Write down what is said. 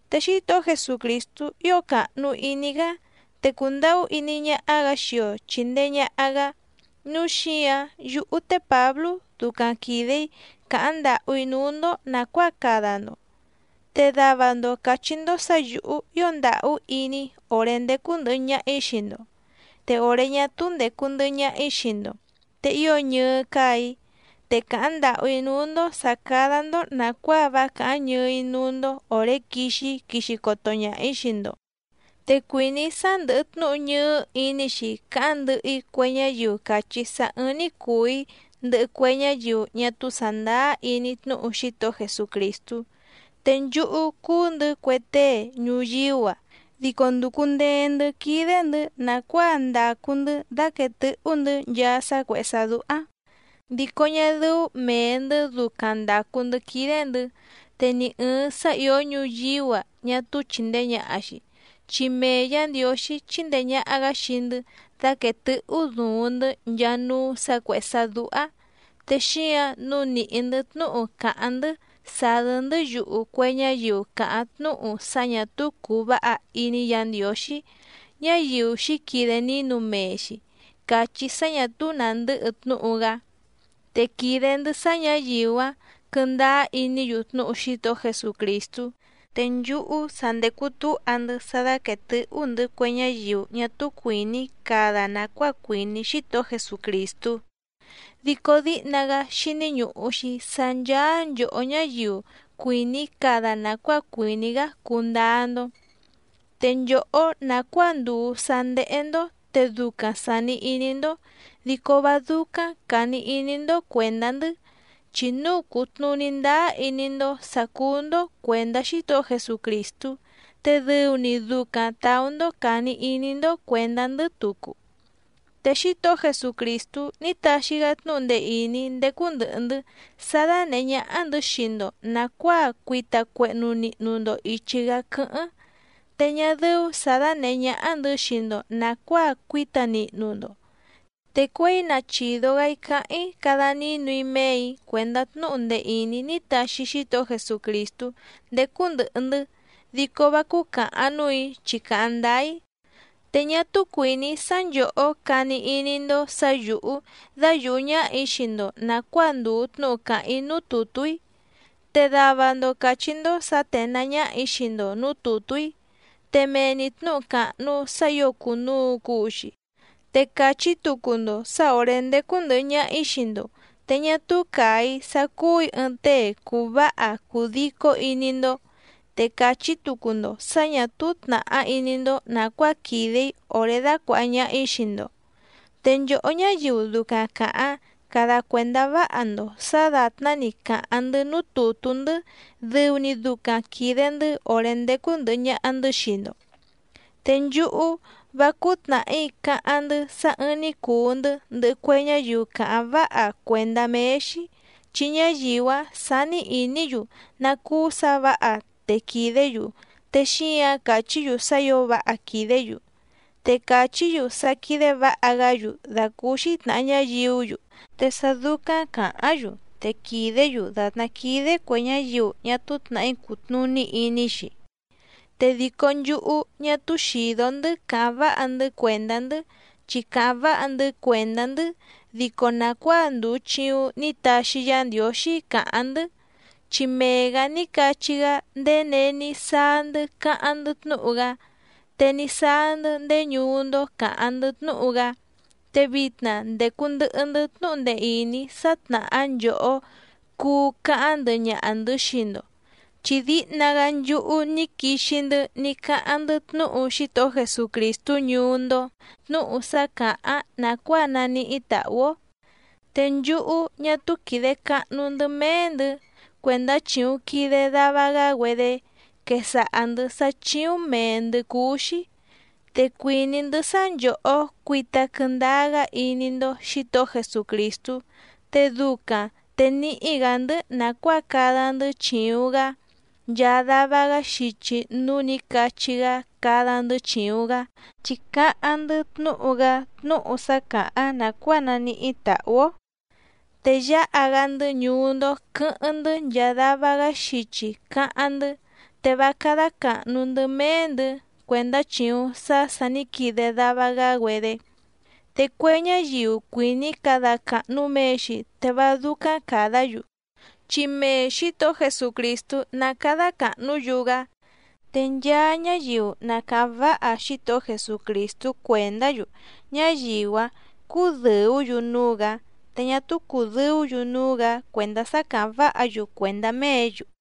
Te Xítohó Jesucrìstú ío càhnu iní‑gá, te cùndahú iní ñáhá‑gǎ xii‑o chìndee ñaha‑gá, núu xíǎⁿ yúhú té Pǎblú ducaⁿ quìde‑í càháⁿ ndàhú‑í núú‑ndó nàcuáa cada‑ndo. Te dava‑ndo càchí‑ndó sǎ yǔhú ío ndàhú iní‑í òré ndécú ndɨ̀hɨ ñaha‑í xii‑ndo, te òré ñá túú ndècu ndɨhɨ ñaha‑í xii‑ndo te ío ñɨɨ́ cáà‑í. Te càháⁿ ndàhú‑í núú‑ndó sǎ cádá‑ndó nàcuáa vá càháⁿ ñɨɨ́‑í núú‑ndó òré quixi‑í quixi coto ñaha‑ǐ xii‑ndo. Te cuìní‑í sá ndɨ̀hɨ tnúhu ñɨɨ́ iní‑xi cáháⁿ ndɨhɨ‑í cue ñáyiu càchí sá ɨ̀ɨⁿ‑ni cuu‑í ndɨhɨ cue ñáyiu ñá túú sàndáá iní tnúhu Xítohó Jesucrìstú. Te nchúhú cùu‑ndɨ́ cue tée ñuyíú‑a, dico ndùcu ndee‑ndɨ́ quídé‑ndɨ̌ nàcuáa ndàcu‑ndɨ́ dáquèe tɨ́hú‑ndɨ̌ nchaa sá cuèhé sá dúhá, dico ñá dɨ́ú mèe‑ndɨ́ ducaⁿ ndàcu‑ndɨ́ quídé‑ndɨ̌, te ni ɨ̀ɨⁿ sá ìó ñuyíú‑a ñá túú chìndee ñaha‑xi, chi mee Yǎ Ndiǒxí chíndèe ñaha‑gá xii‑ndɨ́ dáquèe tɨ́hú duuⁿ‑ndɨ́ nchaa núú sǎ cuèhé sá dúhá. Te xíǎⁿ nǔu nìhí‑ndɨ́ tnúhu càháⁿ‑ndɨ́ sàdɨ́‑ndɨ́ yuhu cue ñáyiu càháⁿ tnúhu sá ñà túú cùu váha iní Yǎ Ndiǒxí, ñáyiu xǐquide nínu mee‑xi càchí sá ñà túú nàndɨ́hɨ tnúhu‑gá. Te quìde‑ndɨ́ sá ñǎyiu‑áⁿ quɨ̀ndáá iní‑yu tnúhu Xítohó Jesucrìstú. Te nchúhú sa ndècu túha‑ndɨ́ sá dáquètɨ́hú‑ndɨ̌ cue ñáyiu ñá túú cuìní cada nàcuáa cuìní Xítohó Jesucrìstú, dico díhna‑gá xíní ñùhu‑xi sá ncháá nchòhó ñáyiu cuìní cada nàcuáa cuìní‑gá cundáá‑ndó. Te nchòhó nàcuáa ndùu sá ndéhé‑ndó te ducaⁿ sàni iní‑ndó, dico vá dúcáⁿ càni iní‑ndó cuèndá‑ndɨ́. Chi núu cùtnuní ndáá iní‑ndó sǎ cúú‑ndó cuèndá Xítohó Jesucrìstú, te dɨu‑ni ducaⁿ tàú‑ndó càni iní‑ndó cuèndá‑ndɨ́ tucu. Te Xítohó Jesucrìstú ní taxi‑gá tnúhu ndee ìní ndécú ndɨ̀hɨ‑ndɨ́ sá dánèhé ñáhá‑ndɨ̌ xii‑ndo nàcuáa cuita cuehnu nihnu‑ndo ìchi‑gá quɨ́hɨ́ⁿ, te ñá dɨ́ú sǎ dánèhé ñáhá‑ndɨ̌ xii‑ndo nàcuáa cuíta nihnu‑ndo, te cuěi na chìdo‑gá‑í cáháⁿ‑í cada nínu‑í méè‑í cuèndá tnúhu ndee ìní ní taxi Xítohó Jesucrìstú ndécú ndɨ̀hɨ‑ndɨ́, dico vá cúcàhaⁿ núù‑í chi càháⁿ ndáá‑í. Te ñá túú cuìní‑í sá nchòhó cani iní‑ndó sǎ yǔhú dáyùhú ñáhà‑í xii‑ndo nàcuáa ndùu tnúhu càháⁿ‑í núú tùtú‑í. Te dava‑ndo càchí‑ndó sǎ ténàá ñáhà‑í xii‑ndo nǔú tùtú‑í, te mee‑ni tnǔhu càhnu sá ǐo cùnuu cuu‑xi, te càchí tucu‑ndo sǎ òré ndécú ndɨ̀hɨ ñaha‑í xii‑ndo te ñá túú càa‑í sá cúù‑í ɨɨⁿ tée cùu váha cùu dico iní‑ndó, te càchí tucu‑ndo sǎ ñà túú tnàhá iní‑ndó nàcuáa quìde‑í òré dácuàha ñaha‑í xii‑ndo. Te nchòhó ñáyiu ducaⁿ càháⁿ cada cuèndá váha‑ndo sǎ dàtná‑ni càháⁿ‑ndɨ́ núú tùtú‑ndɨ́ dɨu‑ni ducaⁿ quìde‑ndɨ́ òré ndécú ndɨ̀hɨ ñaha‑ndɨ́ xii‑ndo. Te nchúhú, vá cúú tnàhí cáháⁿ‑ndɨ́ sá ɨ̀ɨⁿ‑ni cuu‑ndɨ́ ndɨhɨ cue ñáyiu càháⁿ váha cuèndá méé‑xí, chi ñáyiu‑áⁿ sání ìní‑yu ná cúú sǎ vǎha te quìdé‑yu te xíǎⁿ càchí‑yu sá ǐo váha quìdé‑yu, te càchí‑yu sá quídé vǎha‑gá‑yu dàcúúxí tnàha ñáyiú‑yu, te sá dúcáⁿ càháⁿ‑yu te quìdé‑yu dàtná quídé cuè ñáyiu ñá túú tnàhí cùtnuní iní‑xi. Te dico nchúhú ñá túú xìdó‑ndɨ́ cáháⁿ váha‑ndɨ́ cuèndá‑ndɨ́, chi càháⁿ váha‑ndɨ́ cuèndá‑ndɨ́ dico nàcuáa ndùu chiuⁿ ní taxi Yá Ndiǒxí càháⁿ‑ndɨ́, chi mee‑gǎ ní cachí‑gá ndèé není sáá‑ndɨ́ cáháⁿ‑ndɨ́ tnúhu‑gá, te ní sáá‑ndɨ́ ndéé ñuú‑ndó càháⁿ‑ndɨ́ tnúhu‑gá. Te vitna ndècu ndɨhɨ‑ndɨ́ tnúhu ndee ìní sá tnàhá nchòhó cuu cáháⁿ ndɨhɨ ñaha‑ndɨ̌ xii‑ndo, chi díhna‑gá nchúhú ní quixi‑ndɨ́ ní cáháⁿ‑ndɨ́ tnúhu Xítohó Jesucrìstú ñuú‑ndó, tnúhu sá càháⁿ nàcuáa naníhí tàhú‑ó. Te nchúhú ñá túú quìde cahnu‑ndɨ́ méé‑ndɨ̌ cuèndá chìuⁿ quide dava‑gá‑güedé quesaha‑ndɨ̌ sá chíúⁿ mèe‑ndɨ́ cúú‑xí. Te cuìní‑ndɨ́ sá nchòhó cuita quɨndáá‑gá iní‑ndó Xǐtohó Jesucrìstú, te ducaⁿ te níhí‑gǎ‑ndɨ́ nàcuáa cada‑ndɨ́ chìuⁿ‑gá nchaa dava‑gá xichi núú nǐ cachí‑gá cada‑ndɨ́ chìuⁿ‑gá. Chi cáháⁿ‑ndɨ́ tnúhu‑gá tnúhu sá càháⁿ nàcuáa naníhí tàhú‑ó, te yáha‑gá‑ndɨ́ ñuú‑ndó quɨ̌hɨ́ⁿ‑ndɨ́ nchaa dava‑gá xichi cáháⁿ‑ndɨ́, te vá cádá càhnu‑ndɨ́ méé‑ndɨ̌ cuèndá chìuⁿ sá sà ní quide dava‑gá‑güedé. Te cue ñáyiu cuìní cada càhnu mee‑xi te vá dúcáⁿ càdá‑yu, chi mee Xǐtohó Jesucrìstú ná càda cahnú‑yu‑gá. Te nchaa ñáyiu na càháⁿ váha Xítohó Jesucrìstú cuèndá‑yu, ñáyiu‑áⁿ cúdɨ̀ú‑yu núú‑gǎ, te ñá túú cùdɨú‑yu núú‑gǎ cuèndá sá càháⁿ váha‑yu cuèndá méě‑yu.